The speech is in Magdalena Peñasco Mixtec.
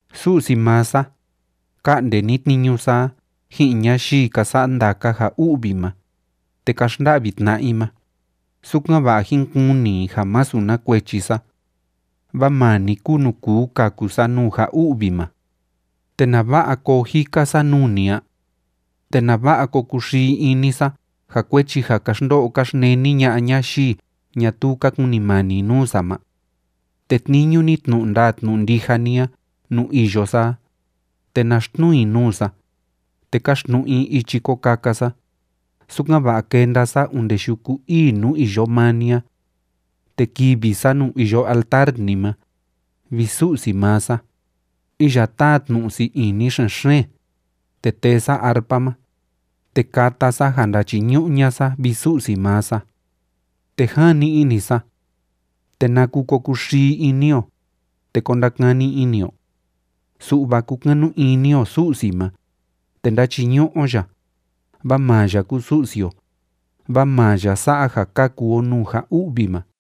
Su'si maa sa, ka'nde ni tniñu sa a ji'in ñayii ka sa'a ndaka ja u'vi ma, te ka xnda'vi tna'a i ma, sukan‑va'a jín kuni i ja másu na kuechi sa. Vaa maa ni kúu nuu kuu kaku sa nuu ja u'vi ma. ¿Te nava'a koo jika sa nuu ni a? ¿Te nava'a ko kuxii ini sa ja kuechi ja ka xndo'o ka xneni ña'a ñayii ñatuu ka kunimani nuu sa ma? Tetniñu ni tnu'u ndaa tnu'u ndija ni a nuu iyo sa a, te na xtnuu i nuu sa, te káxtnu'u i ichi ko kaka sa, sukan‑va'a kenda sa onde yuku ii nuu iyo maa ni a. Te kivi sa nuu iyo altar ni ma, vi Su'si maa sa, iya táa tnu'u sii ini xen‑xeen, te tee sa arpa ma, te kata sa ja ndáchiñu'u ña'a sa, vi Su'si maa sa. Te jani ini sa: ¿Te naku ko kuxii ini o, te ko ndakani ini o? Su'va kúkanu ini o Su'si ma, te ndáchiñu'u o ya, vaa maa ya kúu Su'si o, vaa maa ya sa'a ja kaku o nuu ja u'vi ma.